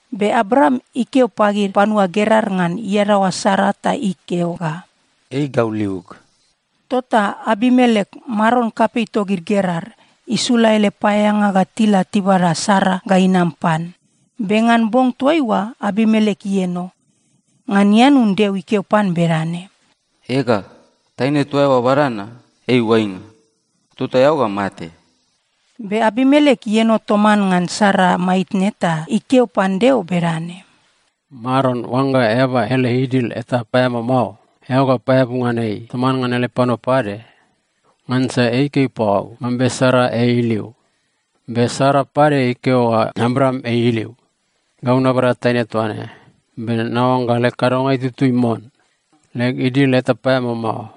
Be Abraam ikeo pagid panua Gerar ngan iadaoa Sara ta ikeo ga, “Ei gau liug.” Tota Abimelek, maron kapei togid Gerar, isula ele paeaeanga ga tila tibada Sara ga inam pan. Be ngan bong toaiua Abimelek ieno. Ngan ianun Deo ikeo pan bedane, “Ega, taine toa eao bada na, ei oainga. Tota eao ga mate!” Be Abimelek ieno toman ngan Sara maitne ta ikeo pan Deo bedane, “Maron, oangga eaba ele idil eta paeamao mao, eao ga paeabu ngan ei toman ngan ele panua pade? Ngansa ei ikeo pagau mambe Sara ei iliu. Be Sara pade ikeo ga Abraam ei iliu. Gau nabada taine toa ne, be naoangga leg kadonga itutui mon. Leg idil eta paeamao mao.”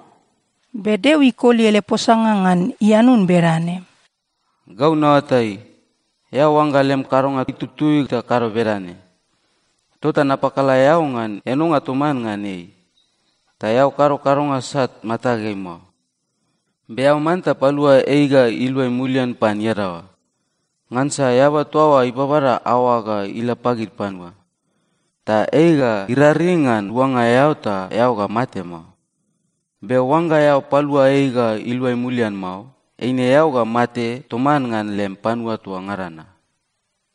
Be Deo ikoli ele posanga ngan ianun bedane, “Gau naoatai, eao oangga lem kadonga itutui ta kado bedane. Tota napakala eao ngan enonga toman ngan ei, ta eao kado kadonga sat matageai mao. Be eao manta palua ei ga iluai mulian pan iadaoa. Ngansa eaba toa oa ibabada aoag ga ila pagid panua. Ta ei ga iraring ngan luanga eao ta eao ga mate mao. Be oangga eao palua ei ga iluai mulian mao, eine eao ga mate toman ngan lem panua toa ngada na.”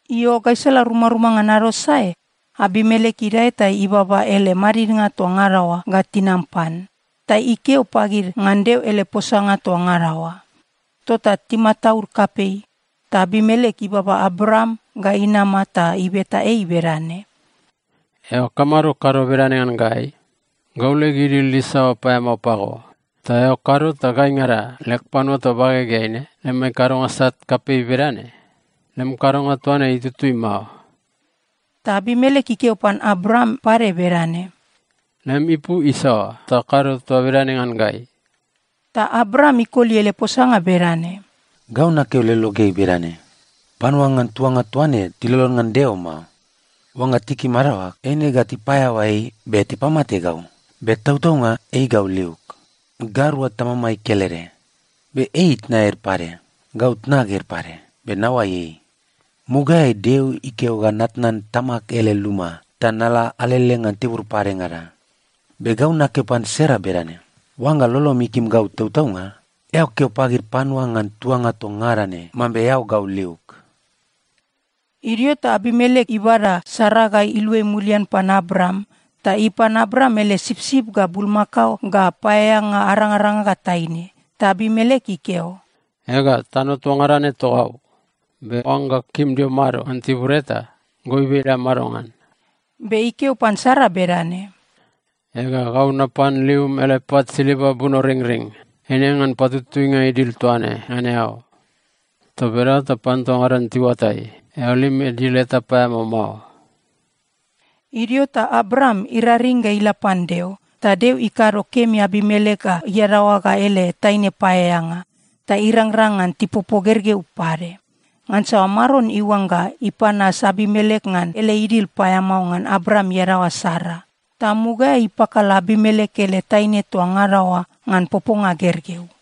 Io, gaisala rumaruma ngan ado sae, Abimelek idae ta ibaba ele madidnga toa ngada oa ga tinam pan, ta ikeo pagid ngan Deo ele posanga toa ngada oa. Tota timataud kapei. Ta Abimelek ibaba Abraam ga inama ta ibeta ei bedane, “Eao kamado kado bedane ngan gai? Gau leg idil isaoa paeamao pago ta eao kado ta gaingada leg panua toa bagegeai ne lemai kadonga sat kapei bedane? Lem kadonga toa ne itutui mao.” Ta Abimelek ikeo pan Abraam pade bedane, “Lem ipu isaoa ta kado toa bedane ngan gai?” Ta Abraam ikoli ele posanga bedane, “Gau nakeo lologeai bedane, ‘Panua ngan tuanga toa ne tilolon ngan Deo mao. Oangga tikim adaoag, eine ga tipaeaoa ei be tipamate gau.’ Be tautaunga ei gau liug. Gairua tamamai kelede, be ei itna ede pade, gau tnag ede pade. Be naoai ei. Mugaeai, Deo ikeo ga natnan tamag ele luma ta nala alele ngan tibur padengada, be gau nakeo pan Sara bedane, ‘Oangga lolom ikim gau tautaunga, eao keo pagid panua ngan tuanga toa ngada ne mambe eao gau liug.’” Idio ta Abimelek ibada Sara ga iluai mulian pan Abraam, ta ipan Abraam ele sipsip ga bulmakao ga paeaeanga arangaranga ga taine. Ta Abimelek ikeo, “Ega, tano toa ngada ne togau. Be oangga eao kim dio mado ngan tibur eta, goibe la mado ngan.” Be ikeo pan Sara bedane, “Ega, gau napan lium ele pat silva bunoringring. Eine ngan patutuinga idil toa ne ngan eao. Toa bedaoa ta panua toa ngada ne tiuatai, eao lem idil eta paeamao mao.” Idio ta Abraam iraring ga ila pan Deo, ta Deo ikado kemi Abimelek ga iadaoa ga ele taine paeaeanga, ta irangrang ngan tipopo gergeu pade. Ngansa Maron iuangga ipanas Abimelek ngan ele idil paeamao ngan Abraam iadaoa Sara, ta mugaeai ipakala Abimelek ele taine toa ngada oa ngan poponga gergeu.